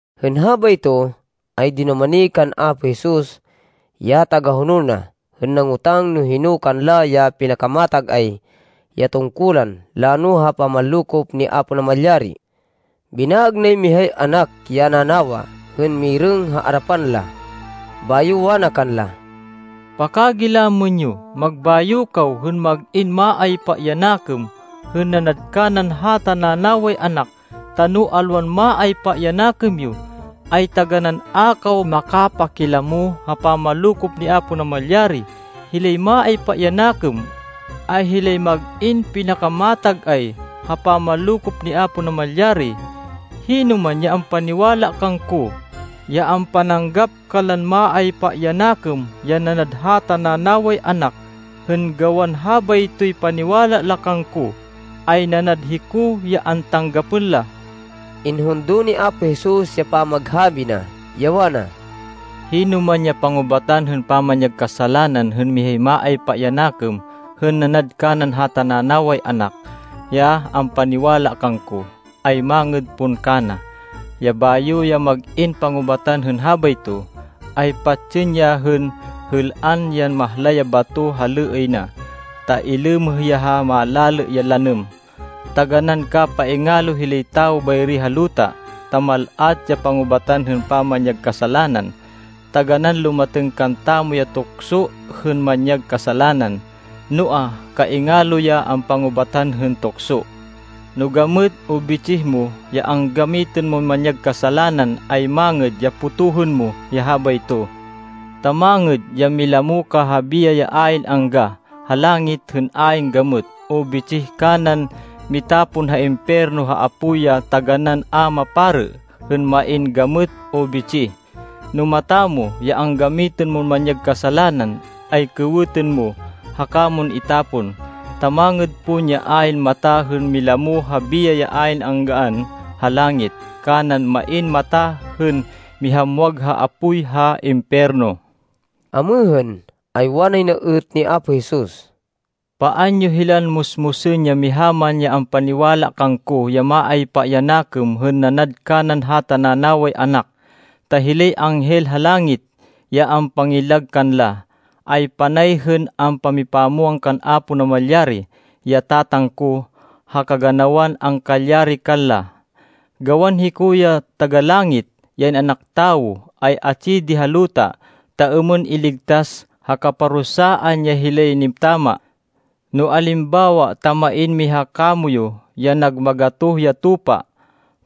Hên habayto, ay dinumani kan Apo Jesus, ya tagahonol na, hên nangotang no hino kanla ya pinakamatag-ay ya tungkulan lano ha pamanlokop ni Apo Namalyari. Binaêg nay mihay anak ya nanawa hên mirêng ha arapan la. Bayo wana kanla, “Pakagilamên yo, magbayo kaw hên mag-in maaypa ya nakêm, hên nanad kanan hata nanaway anak, ta no alwan maaypa ya nakêm yo, ay taganán a kaw makapakilamo ha pamanlokop ni Apo Namalyari. Hilay maaypa ya nakêm, ay hilay mag-in pinakamatag-ay ha pamanlokop ni Apo Namalyari. Hinoman ya ampaniwala kangko, ya ampananggap kanlan maaypa ya nakêm ya nanad hata nanaway anak, hên gawan habaytoy paniwala la kangko, ay nanad hiko ya antanggapên la.” Inhundo ni Apo Jesus ya pamaghabi na, ya wana, “Hinoman ya pangubatan hên pamanyag kasalanan hên mihay maaypa ya nakêm hên nanad kanan hata nanaway anak ya ampaniwala kangko, ay mangêd pon kana, ya bayo ya mag-in pangubatan hên habayto, ay patsên ya hên êl-an yan mahlay ya bato ha lêêy na, ta ilêmêh ya ha malalê ya lanêm. Taganán kapaingalo hilay tawo bayri ha luta, ta mal-at ya pangubatan hên pamanyag kasalanan. Taganán lumatêng kantamo ya tukso hên manyag kasalanan, noa, kaingalo ya ampangubatan hên tukso. “No gamêt o bitsih mo ya anggamitên mon manyag kasalanan, ay mangêd ya potohên mo ya habayto. Ta mangêd ya milamo ka ha biyay ya ayn angga ha langit hên ayn gamêt o bitsih kanan mitapon ha impiyerno ha apoy ya taganán a maparê hên main gamêt o bitsih. No mata mo ya anggamitên mon manyag kasalanan, ay kêwêtên mo haka mon itapon. Ta mangêd pon ya ayn mata hên milamo ha biyay ya ayn anggaan ha langit, kanan main mata hên mihamwag ha apoy ha impiyerno.” Amêhên, ay wanay na êt ni Apo Jesus, “Paan yo hilan musmusên ya miha man ya ampaniwala kangko ya maaypa ya nakêm hên nanad kanan hata nanaway anak, ta hilay anghel ha langit, ya ampangillag kanla, ay panay hên ampamipamwang kan Apo Namalyari, ya Tatang ko, ha kaganawan angkalyari kanla. [Gawan hiko, ya Taga-Langit, ya In-anak Tawo, ay atsi di ha luta, ta êmên iligtas ha kaparusaan ya hilay nitama.] “No alimbawa ta main miha kamoyu ya nag magatoh ya tupa,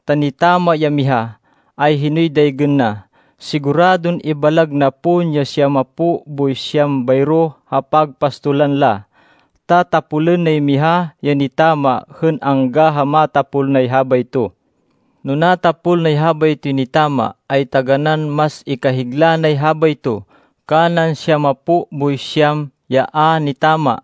ta nitama ya miha, ay hinoy daygên na? Siguradon ibalag na pon ya siyamapo boy siyam bayro ha pagpastolan la, ta tapolên nay miha ya nitama hên angga ha matapol nay habayto. No natapol nay habaytoy nitama, ay taganán mas ikahigla nay habayto, kanan siyamapo boy siyam ya a nitama.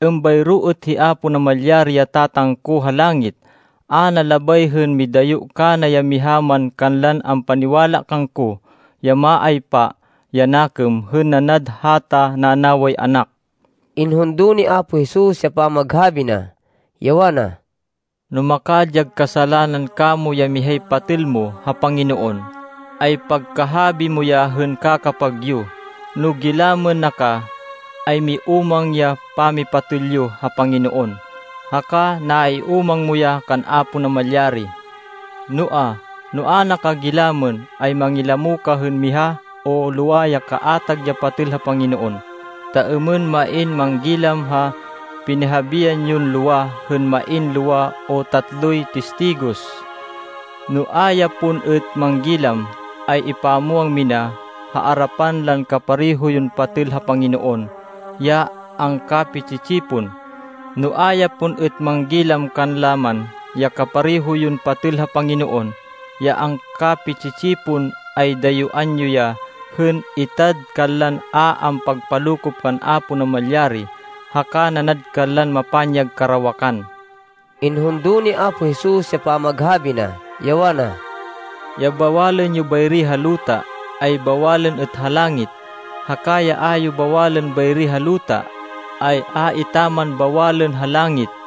Êmbayro êt hi Apo Namalyari, ya Tatang ko ha langit. A na labay hên midayo kana ya miha man kanlan ampaniwala kangko ya maaypa ya nakêm hên nanad hata nanaway anak.” Inhundo ni Apo Jesus ya pamaghabi na, ya wana, “No makadyag kasalanan kamo ya mihay patêl mo ha Panginoon, ay pagkahabi mo ya hên kakapag yo. No gilamên na ka, ay miúmang ya pamipatêl yo ha Panginoon, haka naiúmang mo ya kan Apo Namalyari. Noa, no a na ka gilamên, ay mangilamo ka hên miha o lowa ya kaatag ya patêl ha Panginoon, ta êmên main manggilam ha pinihabian yon lowa hên main lowa o tatloy tistigos. No a ya pon êt manggilam, ay ipamwang mina ha arapan lan kapareho yon patêl ha Panginoon ya angkapi-tsi-tsipon. No a ya pon êt manggilam kanla man ya kapareho yon patêl ha Panginoon ya angkapi-tsi-tsipon, ay dayuán yo ya hên itad kanlan a ampagpalokop kan Apo Namalyari, haka nanad kanlan mapanyag karawakan.” Inhundo ni Apo Jesus ya pamaghabi na, ya wana, “Ya bawalên yo bayri ha luta, ay bawalên êt ha langit, haka ya a yo bawalên bayri ha luta, ay a etaman bawalên ha langit.”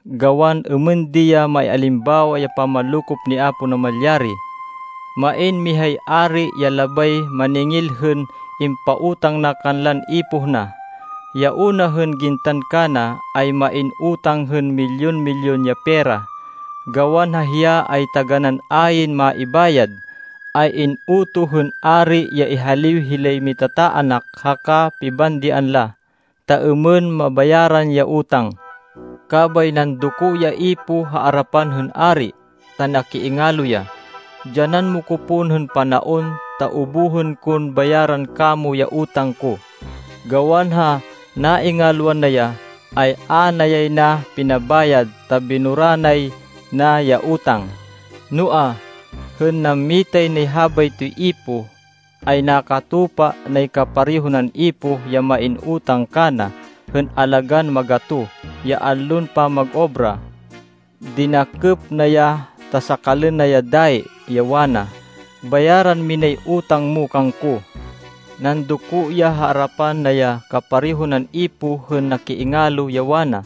Gawan êmên di ya maialimbawa ya pamanlokop ni Apo Namalyari. Main mihay ari ya labay maningil hên impautang na kanlan ipoh na. Ya una hên gintan kana, ay main utang hên milyun-milyun ya pera. Gawan ha hiya ay taganán ayn maibayad, ay in-utoh hên ari ya ihaliw hilay mitataanak haka pibandian la, ta êmên mabayaran ya utang. Kabay nandoko ya ipoh ha arapan hên ari ta nakiingalo ya, ‘Dyanan mo ko pon hên panaon ta ubuhên kon bayaran kamo ya utang ko.’ Gawan ha naingalwan na ya, ay a na yay na pinabayad ta binura nay na ya utang. “Noa, hên nammitay nay habaytoy ipoh, ay nakatupa nay kapareho nan ipoh ya main utang kana hên alagán magatoh ya allon pamag-obra. Dinakêp na ya ta sakalên na ya dayi, ya wana, ‘Bayaran minay utang mo kangko!’ Nandoko ya ha arapan na ya kapareho nan ipoh hên nakiingalo, ya wana,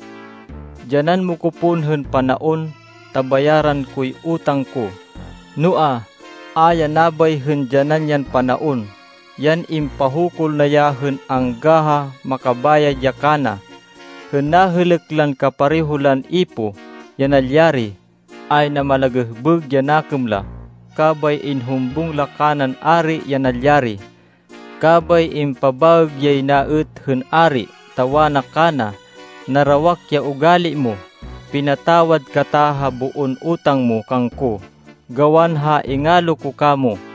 ‘Dyanan mo ko pon hên panaon, ta bayaran koy utang ko.’ Noa, a ya nabay hên dyanan yan panaon. Yan impahukul na ya hên angga ha makabayad ya kana. Hên nahêlêk lan kapareho lan ipoh, ya nalyari, ay namalagêhbêg ya nakêm la, kabay inhumbung la kanan ari ya nalyari. Kabay impabaêg yay na êt hên ari, ta wana kana, ‘Narawak ya ugali mo! Pinatawad kata ha boon utang mo kangko, gawan ha ingalo ko kamo.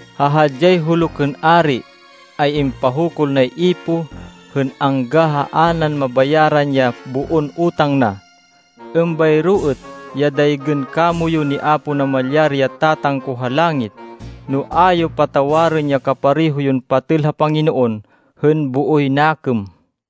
Ha hadyay huluk hên ari, ay impahukul nay ipoh, hên angga ha a nan nabayaran ya boon utang na. Êmbayro êt ya daygên kamoyu ni Apo Namalyari ya Tatang ko ha langit, no a yo patawarên ya kapareho yon patêl ha Panginoon hên booy nakêm.”